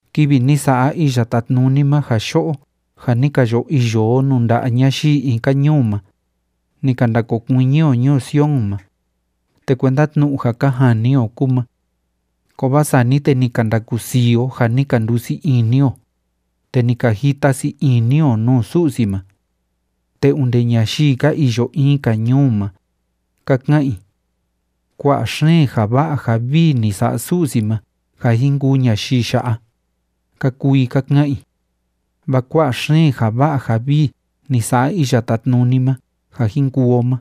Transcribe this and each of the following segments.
Kivi ni sa'a Iya Tátnuni ma ja yo'o ja ni ka yo iyo o nuu nda'a ñayii in‑ka ñuu ma, ni ka ndakokuiñi o ñuu Sion ma, te kuenda tnu'u ja ka jani o kúu ma. Kovaa sani te ni ka ndakusii o ja ni ka ndusii ini o, te ni ka jita sii ini o nuu Su'si ma. Te onde ñayii ka iyo in‑ka ñuu ma, ka ka'an i: “Kua'a xeen ja va'a ja vii ni sa'a Su'si ma ja jin kuu ñayii ya'a”, ka kuu i ka ka'an i. Vaa kua'a xeen ja va'a ja vii ni sa'a Iya Tátnuni ma ja jin kuu o ma,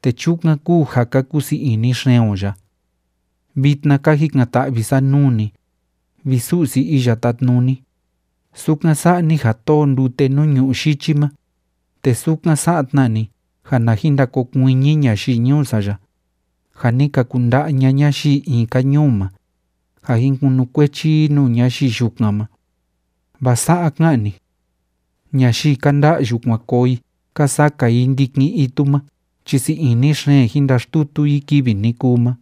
te chukan kúu ja ka kusii ini xeen o ya. Vitna ka jikan‑ta'vi sa nuu ni, vi Su'si Iya Tátnuni, sukan sa'a ni ja tóo ndute nuu ñu'ú yichi ma, te sukan sa'a tna ni ja na jin ndakokuiñi ñayii ñuu sa ya, ja ni ka kunda'a ña'a ñayii in‑ka ñuu ma, ja jin kunukuechi i nuu ñayii yukan ma. Vaa sa'a ka'an ni: “Ñayii ka nda'yu kuan koo i ka saka i ndikin itu ma chi sii ini xeen jin ndaxtutu i kivi ni kuu ma.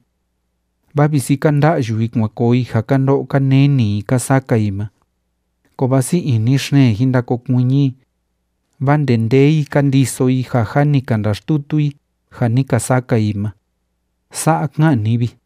Vaa visi ka nda'yu i kuan koo i ja ka ndo'o ka neni i ka saka i ma, kovaa sii ini xeen jin ndakokuiñi i, vaa ndendee i ka ndiso i ja jâ ni ka ndaxtutu i ja ni ka saka i ma.” Sa'a ka'an ni vi.